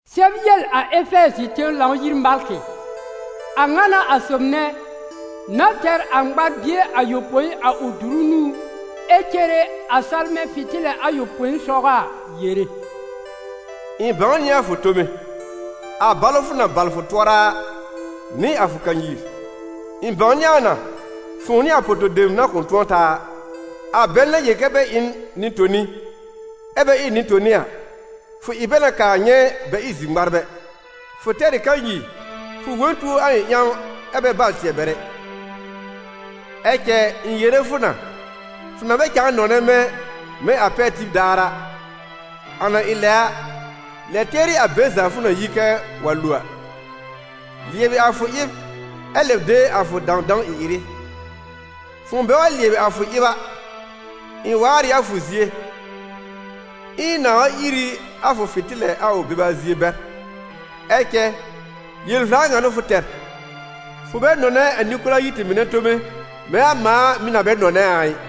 «Sɛb yel a Efɛɛzɩ tẽw Lãw-yir malkɩ: ‹A ŋa n'a a sob nɛ, na tɛr a ŋmar-bie ayopõi a ʋ dʋrʋ nũú ɛ cere a salmɛ̃ fɩ̃tɩlɩ ayopõi sɔgɔ a, yere: ɩ̃ bãw nɩ a fʋ tome, a balʋ fʋ na bal fʋ tʋɔra a, nɩ a fʋ kanyir. Ɩ̃ bãwnɩ a na fʋ̃ʋ nɩ a po-to-dem na kʋ̃ tʋ̃ɔ taa a; a bɛl na yel kɛ́ bɛ ɩ n nɩ-toni ɛ bɛ ɩ nɩ-toni a, fʋ ɩ bɛ na kaa nyɛ̃ bɛ ɩ zir-ŋmarbɛ. Fʋ tɛr ɩ kanyir, fʋ wõ n tuo a ɩ̃ ƴãw ɛ bɛ bal tɩɛ bɛr ɛ. Ɛ cɛ, ɩ̃ yere fʋ na: fʋ na bɛ cãa nɔnɛ mɛ̃ mɛ̃ a pɛr tib daar a. A na ɩ lɛ a, lɛ tɩɛrɩ a be za fʋ na yi kɛ wa lo a! Lɩɛbɩ a fʋ ɩb ɛ lɛb de a fʋ dãwdãw ɩ-ɩrɩ. Fʋ̃ʋ bɛ wa lɩɛbɩ a fʋ ɩb a, ɩ̃ waar ɩ a fʋ zie, ɛ ɩ̃ na wa ír ɩ a fʋ fɩ̃tɩlɛ a ʋ beba zie bɛr. Ɛ cɛ, yel-vla ŋa n'ʋ fʋ tɛr: fʋ bɛ nɔnɛ a Nɩkolayiti mɩnɛ tome mɛ̃ a mãa mɩ̀ na bɛ nɔnɛ a a ɩ.›»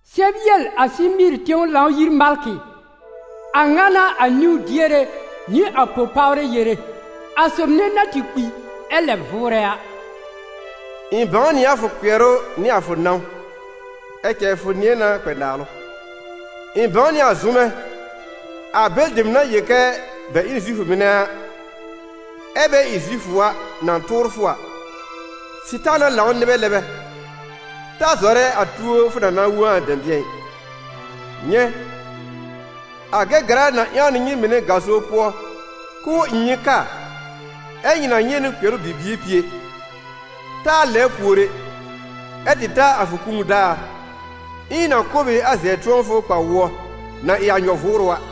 «Sɛb yel a Sɩmɩɩr tẽw Lãw-yir malkɩ: ‹A ŋa n'a a niwn-diere nɩ a po-pawrɛ yere, a sob nɛ na tɩ kpi ɛ lɛb vʋʋrɛ a: ɩ̃ bãw nɩ a fʋ kpɩɛrʋ nɩ a fʋ nãw (ɛ cɛ, fʋ nɩ̃ɛ na kpɛ naalʋ). Ɩ̃ bãw nɩ a zʋmɛ, a bɛlɩ dem na yel kɛ bɛ ɩ n Zifʋ mɩnɛ ɛ bɛ ɩ Zifʋ a, na tʋʋr fʋ a: Sɩtaana lãw nɩbɛ nɛ bɛ. Ta zɔrɛ a tuo fʋ na na wõ a dɛ̃bɩ̃ɛ ɩ. Nyɛ̃, a Gɛgɛra na ƴãw nɩ nyɩ mɩnɛ gaso pʋɔ k'ʋʋ ɩ nyɩ kaa, ɛ́ nyɩ na nyɛ̃ nɩ kpɩɛrʋ bibie pie. Taa lɛbr pùor ɛ, ɛ tɩ ta a fʋ kũu daar, ɛ ɩ̃ na kʋ̀ b ɩ a zɛb-tʋ̃ɔfʋ kpa-wʋɔ, na ɩ a nyɔ-vʋʋrʋ a.›»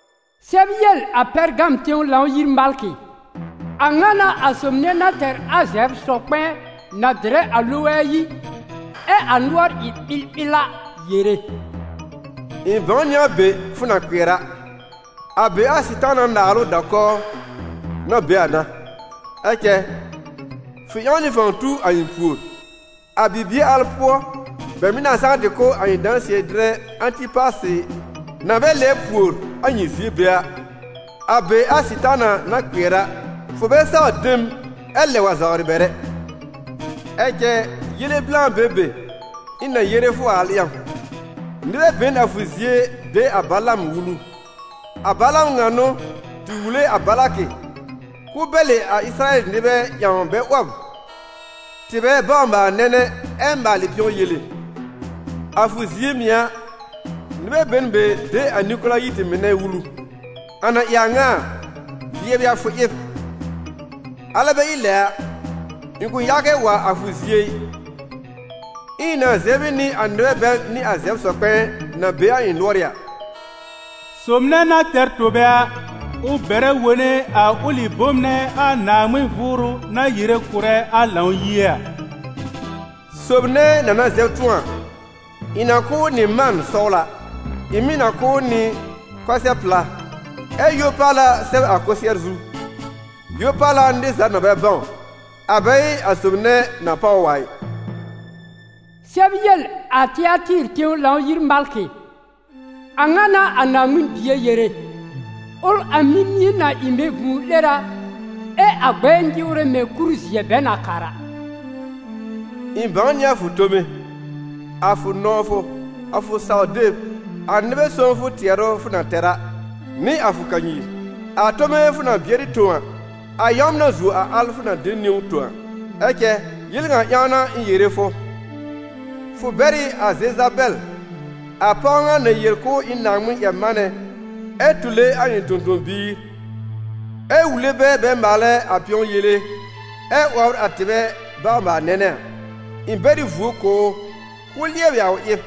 «Sɛb yel a Pɛrgam tẽw Lãw-yir malkɩ: ‹A ŋa n'a a sob nɛ na tɛr a zɛbr-sɔ-kpɛ̃ɛ na dɩrɛ a loge ayi, ɛ a nʋɔr ɩ ɓɩlɓɩl a, yere: ɩ̃ bãw nɩ a be fʋ na kpɩɛr a: a be a Sɩtaana naalʋ da-kɔw na be a n'a. Ɛ cɛ, fʋ ƴãw nɩ fãw tu a ɩ̃ pùor. A bibie al pʋɔ bɛ mɩ̀ na saa tɩ kʋ́ a ɩ̃ dãsɩɛ-dɩrɛ Ãtɩpasɩ na bɛ lɛbr pùor a nyɩ zie be a, a be a Sɩtaana na kpɩɛr a, fʋ bɛ saw de m ɛ lɛb wa zawrɩ bɛr ɛ. Ɛ cɛ, yele blã be n be, ɩ̃ na yere fʋ a al ƴãw: nɩbɛ be n a fʋ zie de a Balaam wulu. A Balaam ŋa n'ʋ tɩ wule a Balakɩ, k'ʋʋ bɛlɩ a Ɩsɩrayɛl nɩbɛ ƴãw bɛ 'wɔb tɩbɛ bawr-maal-nɛnɛ ɛ maalɩ pɩ̃ɔ yele. A fʋ zie mɩ̀ a, nɩbɛ be n be de a Nɩkolayiti mɩnɛ wulu. A na ɩ a ŋa a, lɩɛbɩ a fʋ ɩb. Alɛ bɛ ɩ lɛ a, ɩ̃ kʋ̃ yaa kɛ wa a fʋ zie ɩ, ɛ ɩ̃ na zɛb ɩ nɩ a nɩbɛ bɛl nɩ a zɛbr-sɔ-kpɛ̃ɛ na be a ɩ̃ nʋɔrɩ́ a.›» «Sob nɛ na tɛr tobe a, ʋ bɛrɛ wone a ʋlɩ bom nɛ a Naaŋmɩn Vʋʋrʋ na yere kʋ̀rɛ a Lãw-yie a.» «Sob nɛ na na zɛb tʋ̃ɔ a, ɩ̃ na kʋ̀ ʋ nɩ mãan sɔwla. Ɩ̃ mɩ̀ na kʋ̀ ʋ nɩ kʋsɛ-pla, ɛ yo-paala sɛb a kʋsɩɛr zu, yo-paala nɩr za na bɛ bãw, a bɛ ɩ a sob nɛ na páw ʋ a ɩ.» «Sɛb yel a Tɩatɩɩr tẽw Lãw-yir malkɩ: ‹ A ŋa n'a a Naaŋmɩn Bie yere, ʋl a mimie na ɩ mɛ̃ vũu-'lera ɛ a gbɛɛ nyɩwrɛ mɛ̃ kur-zɩɛ bɛ na kàr a. Ɩ̃ bãw nɩ a fʋ tome, a fʋ nɔ̃wfʋ, a fʋ saw-deb, a nɩbɛ sõwfʋ tɩɛrʋ fʋ na tɛr a, nɩ a fʋ kanyir. A tome fʋ na bɩɛrɩ tõ a, a yãwmɛ na zuo a al fʋ na de niwn tõ a. Ɛ cɛ, yel ŋa ƴãw n'a ɩ̃ yere fʋ: fʋ bɛr ɩ a Zezabɛl, a pɔw ŋa na yel k'ʋʋ ɩ n Naaŋmɩn-ƴɛr-manɛ ɛ tule a ɩ̃ tõ-tõ-biir, ɛ wule bɛ bɛ maalɛ a pɩ̃ɔ yele ɛ 'wɔbr a tɩbɛ bawr-maal-nɛnɛ a. Ɩ̃ bɛr ɩ vuo kʋ̀ ʋ k'ʋʋ lɩɛbɩ a ʋ ɩb,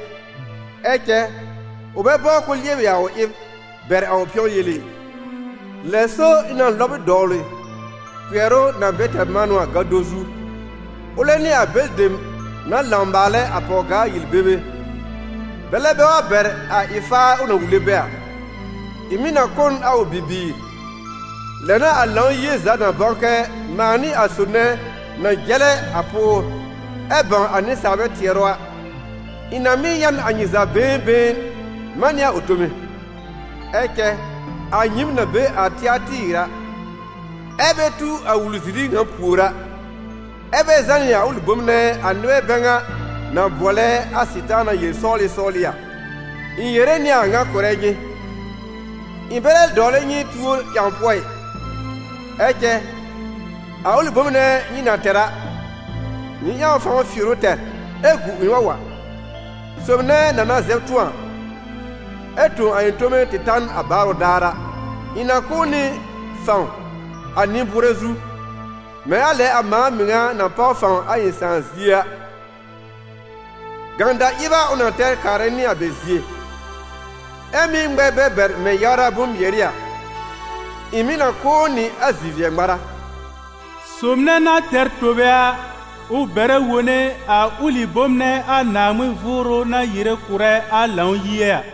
ɛ cɛ, ʋ bɛ bɔbr k'ʋʋ lɩɛbɩ a ʋ ɩb, bɛr a ʋ pɩ̃ɔ yele ɩ. Lɛ so ɩ̃ na lɔb ʋ dɔwlɩ kpɩɛrʋ na bɛ tɛr manʋ a gado zu, ʋlɛ nɩ a bɛlɩ dem na lãw maalɛ a pɔw-gaa yel-bebe, bɛlɛ bɛ wa bɛr a ɩ-faar ʋ na wule bɛ a. Ɩ̃ mɩ̀ na kʋ́ n a ʋ bibiir. Lɛ n'a a Lãw-yie za na bãw kɛ mãa n'ɩ a sob nɛ na jɛlɛ a pʋʋr, ɛ bãw a nɩsaalbɛ tɩɛrʋ a. Ɩ̃ na mɩ́ ya n a nyɩ za been been man nɩ a ʋ tome.›» «Ɛ cɛ, a nyɩɩm na be a Tɩatɩɩr a, ɛ́ bɛ tu a wul-ziri ŋa pùor a, ɛ́ bɛ zànɩ a ʋlɩ bom nɛ a nɩbɛ bɛ ŋa na bʋɔlɛ a ‹ Sɩtaana yel-sɔwlɩ sɔwlɩ › a, ɩ̃ yere nɩ a ŋa kʋ̀rɛ nyɩ: ɩ̃ bɛ lɛ dɔwlɛ nyɩ tuor ƴãw pʋɔ ɩ. Ɛ cɛ, a ʋlɩ bom nɛ nyɩ na tɛr a, nyɩ ƴãw fãw fɩɩr ʋ tɛr ɛ gu ɩ̃ wa wa.» «Sob nɛ na na zɛb tʋ̃ɔ, ɛ tõ a ɩ̃ tome tɩ ta n a baarʋ daar a, ɩ̃ na kʋ̀ ʋ nɩ fãw a nɩ-bʋʋrɛ zu, mɛ̃ a lɛ a mãa mɩŋa na páw fãw a ɩ̃ Sãà zie a; gãda-ɩb a ʋ na tɛr kaarɛ nɩ a bɛ zie, ɛ́ mɩ́ ŋmɛr bɛ bɛr mɛ̃ yawra bʋ̃-mɩɛrɩ a. Ɩ̃ mɩ̀ na kʋ̀ ʋ nɩ a zi-vɩɛ-ŋmara.» «Sob nɛ na tɛr tobe a, ʋ bɛrɛ wone a ʋlɩ bom nɛ a Naaŋmɩn Vʋʋrʋ na yere kʋ̀rɛ a Lãw-yie a.»